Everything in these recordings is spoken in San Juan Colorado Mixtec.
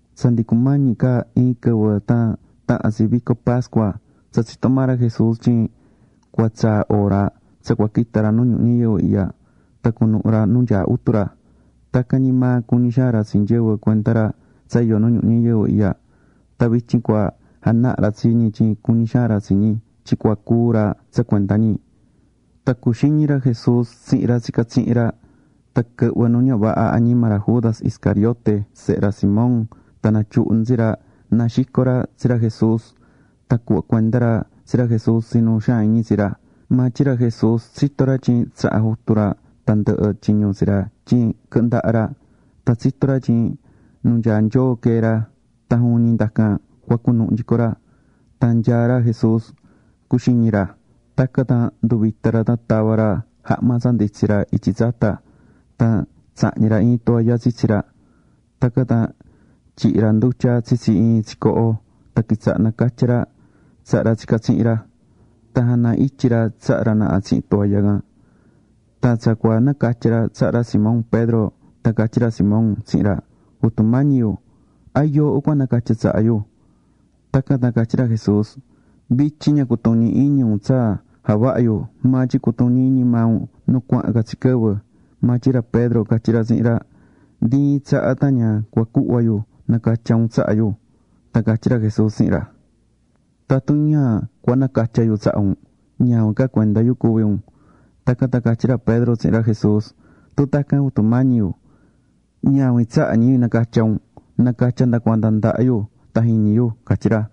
Tsa ndi cumañi ca iin quɨvɨ tan tahan tsi vico pascua, tsa tsitó maa ra Jesús tyin tsa cua tsaa hora tsa cua quita ra nu ñuhu ñayɨvɨ ihya tan cunuhu ra nu nyaá Jutu ra. Tacan ñi maa cuñí xaan ra tsi nyɨvɨ cuenda ra tsa iyó nu ñuhu ñayɨvɨ ihya. Tan vityin cua janaha ra tsi ñi tyin cuñí xaan ra tsi ñi tyin cua cúu ra tsa cuenda ñi. Tan cuxiñi̱ ra Jesús tsihin ra tsicá tsihin ra. Tan quɨhvɨ̱ nu ña vaha añima ra Judas Iscariote sehe ra Simón tan natyuhu̱ nu tsi ra na xico ra tsi ra Jesús tan cuhva cuenda ra tsi ra Jesús tsi nu xaan iñi tsi ra. Maa tyin ra Jesús tsitó ra tyin tsaha̱ Jutu ra tandɨhɨ tyiñu tsi ra tyin quɨhɨ ndaha ra. Tan tsitó ra tyin nu nyaá Nyoo quee̱ ra tan juvin ñi ndacan cua cunuhu nyico ra. Tan nyaá ra Jesús cuxiñí ra. Tacan tan nduvita̱ ra tan tava̱ ra jahma tsa nditsí ra ityi tsata, tan tsahñi̱ ra iin toalla tsitsi ra. Tacan tan tyihi̱ ra ndutya tsitsi iin tsicoho tan quitsaha̱ nacatyá ra tsaha ra tsicá tsihin ra. Tan jana ityi̱ ra tsaha ra naha tsihin toalla can. Tan tsa cua nacatya ra tsaha ra Simón Pedro tan catyí ra Simón tsihin ra: ―Jutu Mañi yu, ¿a yooho cua nacatya tsaha yu? Tacan tan catyí ra Jesús: ―Vityin ña cutuñí iñi un tsa javahá yu, maa tyin cutuñi iñi maa un nu cuahán ca tsi quɨvɨ. Maa tyin ra Pedro catyí ra tsihin ra: ―Ndi iin tsaha tan ña cua cuhva yu nacatya un tsaha yu. Tan catyí ra Jesús tsihin ra: ―Tatun ña cua nacatya yu tsaha un, ñavin ca cuenda yu cua cuvi un. Tacan tan catyí ra Pedro tsihin ra Jesús: ―Tun tacan, Jutu Mañi yu, ñavin tsaha ñi yu nacatya un. Na̱catya nda cuanda ndaha yu tan jiñi yu ―catyí ra.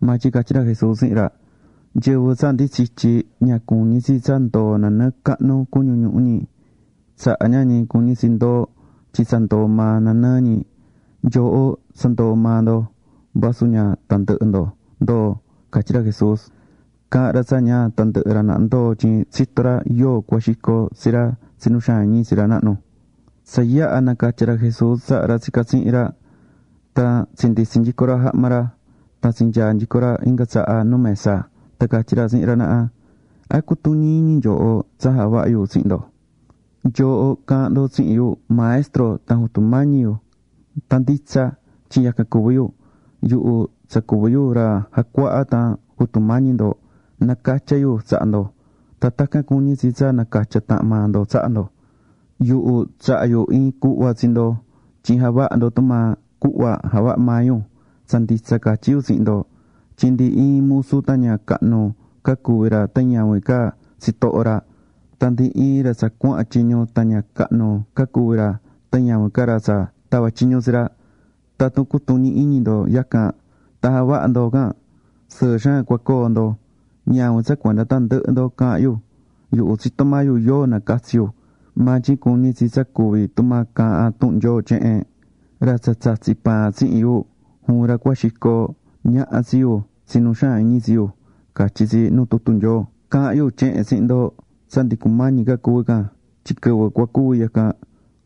Maa tyin catyí ra Jesús tsihin ra: ―Nyɨvɨ tsa ndi tsityi̱, ña cuñí tsi tsa ndoo nanɨɨ cahnu cuñu ñuhu ñi. Tsaha ña ñi cuñí tsi ndoo, tyin tsa ndoo maa nanɨɨ ñi. Nyooho tsa ndoo̱ maa ndo, vasu ña tandɨhɨ ndo ndoo̱ ―catyí ra Jesús. Caha̱n ra tsa ña tandɨhɨ ra naha ndoo tyin tsitó ra yóo cua xico tsi ra tsi nu xaan iñi tsi ra nahnu. Tsa yaha̱ nacatya̱ ra Jesús tsaha ra tsicá tsihin ra, tan tsinditsi̱ nyico ra jahma ra, tan tsinyaa̱ nyico ra inga tsaha nu mesa tan catyí ra tsihin ra naha: ―¿A cutuñí iñi nyooho tsa javaha̱ yu tsihin ndo? Nyooho caahán ndo tsihin yu, “Maestro tan Jutu Mañí yu”, tan nditsa tyin yacan cuví yu. Yuhu tsa cuví yu Ra Jacuahá tan Jutu Mañi ndo, nacatya̱ yu tsaha ndo, tan tacan cuñí tsi tsa nacatya tahan maa ndo tsaha ndo. Yuhu tsaha̱ yu iin cuhva tsi ndo tyin ja̱vaha ndo tumaa cuhva javaha̱ maa yu. Tsa nditsa catyí yu tsihin ndo tyin ndi iin musu tan ña cahnu ca cuví ra tan ñavin ca tsitoho ra. Tan ndi iin ra tsa cuahán tyiñu, tan ña cahnu ca cuví ra tan ñavin ca ra tsa tava̱ tyiñu tsi ra. Tatun cutuñí iñi ndo yacan, tan javahá ndo can, sɨɨ xaan cua coo ndo. ’Ñavin tsa cuenda tandɨhɨ ndo caahán yu. Yuhu tsitó maa yu yóo nacatsi̱ yu. Maa tyin cuñí tsi tsa cuvi tumaa caahán tuhun Nyoo tyehen: “Ra tsa tsatsi̱ paan tsihin yu, juvin ra cua xico ñaha tsi yu tsi nu xaan iñi tsi yu”, catyí tsi nu tutu Nyoo. Caahán yu tyehen tsihin ndo tsa ndi cumañi ca cuvi can tyin quɨvɨ cua cuvi yacan,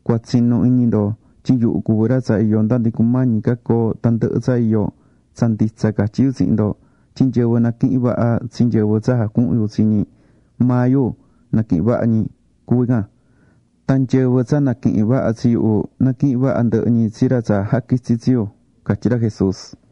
cua tsinu iñi ndo tyin yuhu cuví ra tsa iyó nda ndi cumañi ca coo tandɨhɨ tsa iyó. Tsa nditsa catyí yu tsihin ndo tyin nyɨvɨ naquihin vaha tsi nyɨvɨ tsa jacuhún yu tsi ñi, maa yu naquihin vaha ñi cuví can. Tan nyɨvɨ tsa naquihín vaha tsi yuhu, naquihín vaha ndɨhɨ ñi tsi ra tsa jaquitsi̱ tsi yu ―catyí ra Jesús.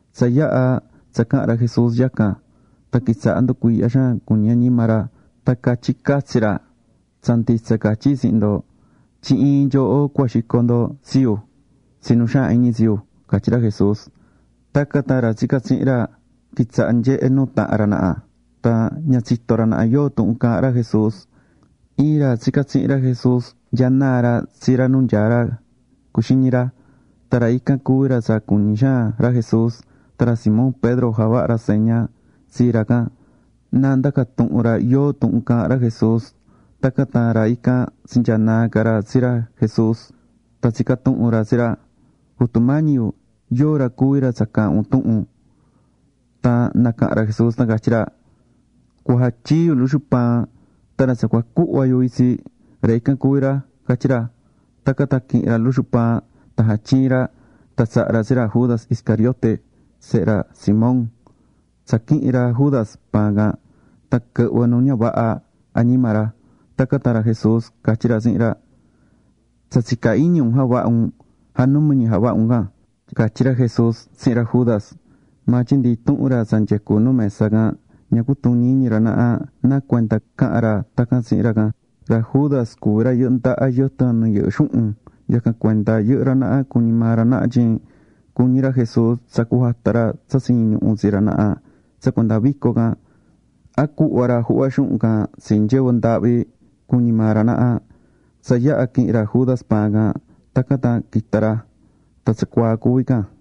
Tsa yaha̱ tsa caha̱n ra Jesús yacan, tan quitsaha̱ nducuiihyá xaan cuñi añima ra, tan catyí catsi ra: ―Tsa nditsa catyí yu tsihin ndo, tyin iin nyooho cua xico ndo tsi yu tsi nu xaan iñi tsi yu ―catyí ra Jesús. Tacan tan ra tsicá tsihin ra, quitsaha̱ nyehé nuu tahan ra naha, tan ña tsitó ra naha yóo tuhun caahán ra Jesús. Iin ra tsicá tsihin ra Jesús nyanaá ra tsi ra nu nyaá ra cuxiñí ra. Tan ra ican cuví ra tsa cuñí xaan ra Jesús. Tan ra Simón Pedro javaha̱ ra seña tsi ra can, na ndaca tuhun ra yoó tuhun caahán ra Jesús. Tacan tan ra ican tsinyaá naa ca ra tsi ra Jesús, tan tsica̱ tuhun ra tsi ra: ―Jutu Mañi yu, ¿yoó ra cuví ra tsa caahán un tuhun? Tan nacaha̱n ra Jesús tan catyí ra: ―Cua jatyii yu luxu paan, tan ra tsa cua cuhva yu itsi, ra ican cuví ra ―catyí ra. Tacan tan quihi̱n ra luxu paan tan jatyii̱ ra, tan tsaha̱ ra tsi ra Judas Iscariote, sehe ra Simón. Tsa quihi̱n ra Judas paan can tan quɨhvɨ̱ nu ña vaha añima ra. Tacan tan ra Jesús catyí ra tsihin ra: ―Tsa tsicá iñi un javaha un, ja̱numi ja̱vaha can ―catyí ra Jesús tsihin ra Judas. Maa tyin ndi intuhun ra tsa nyecú nu mesa can, ña cutuñí iñi ra naha nacuenda caha̱n ra tacan tsihin ra can. Ra Judas cuví ra yɨhɨ́ ndaha yɨtɨn nu yɨhɨ́ xuhun, yacan cuenda yɨhɨ́ ra naha cuñi̱ maa ra naha tyin cuñí ra Jesús tsa cujata ra tsa tsiñí ñuhu tsi ra naha tsa cuenda vico can, a cuhva ra juhva xuhun can tsi nyɨvɨ ndaahvi, cuñi̱ maa ra naha. Tsa yaha̱ quihi̱n ra Judas paan can, tacan tan quita̱ ra. Tan tsacuaa cuví can.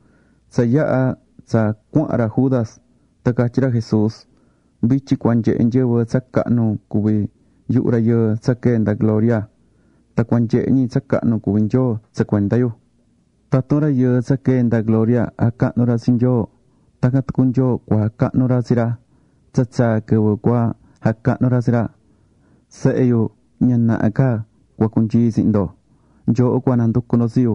Tsa yaha̱ tsa cuahán ra Judas, tan catyí ra Jesús: ―Vityin cua nyehe nyɨvɨ tsa cahnu cuví yuhu Rayɨɨ tsa quee̱ nda gloria. Tan cua nyehe ñi tsa cahnu cuví Nyoo tsa cuenda yu. Tatun Rayɨɨ tsa quee̱ nda gloria jacahnú ra tsi Nyoo, tacan tucu Nyoo cua jacahnu ra tsi ra. Tsa tsaa̱ quɨvɨ cua jacahnu ra tsi ra. Sehe yu, ña naha ca cua cunyii yu tsihin ndo. Nyooho cua nanducu ndo tsi yu,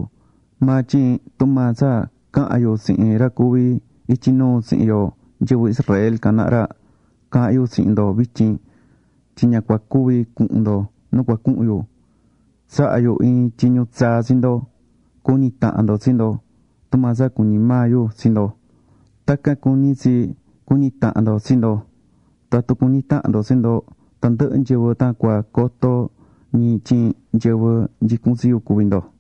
maa tyin tumaa tsa caha̱n yu tsihin ra cuví ityi nuu tsihin yo nyɨvɨ Israel can naha ra, caahán yu tsihin ndo vityin, tyin ña cua cuvi cuhun ndo nu cua cuhun yu. Tsahá yu iin tyiñu tsaa tsi ndo: Cu̱ñi tahan ndo tsi ndo. Tumaa tsa cuñí maa yu tsi ndo, tacan cuñí tsi tsa cuñí tahan ndo tsi ndo. Tatun cuñí tahan ndo tsi ndo, tandɨhɨ nyɨvɨ tan cua coto ñi tyin nyɨvɨ nyicún tsi yu cuví ndo.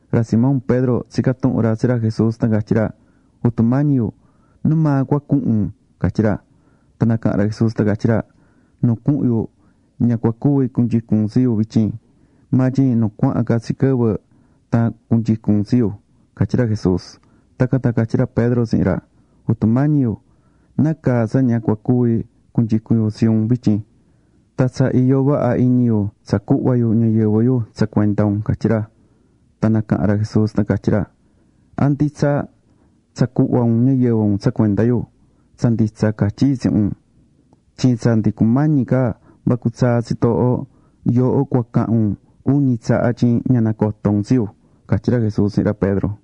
Ra Simón Pedro tsica̱ tuhun ra tsi ra Jesús tan catyí ra: ―Jutu Mañi yu, ¿nu maa cua cuhun un? ―catyí ra. Tan nacaha̱n ra Jesús tan catyí ra: ―Nu cuhun yuhu, ña cua cuvi cunyicún un tsi yu vityin. Maa tyin nu cuahán ca tsi quɨvɨ, tan cunyicun un tsi yu ―catyí ra Jesús. Tacan tan catyí ra Pedro tsihin ra: ―Jutu Mañi yu, ¿nácaa tsa ña cua cuvi cunyicun yu tsi un vityin? Tan tsa iyó vaha iñi yu tsa cuhva yu ñayɨvɨ yu tsa cuenda un ―catyí ra. Tan nacaha̱n ra Jesús tan catyí ra: ―¿A nditsa tsa cuhva un ñayɨvɨ un tsa cuenda yu? Tsa nditsa catyí yu tsihin un, tyin tsa ndi cumañi ca vacu tsaa tsitooho, yooho cua cahan un uñi tsaha tyin ña nacotó un tsi yu ―catyí ra Jesús tsihin ra Pedro.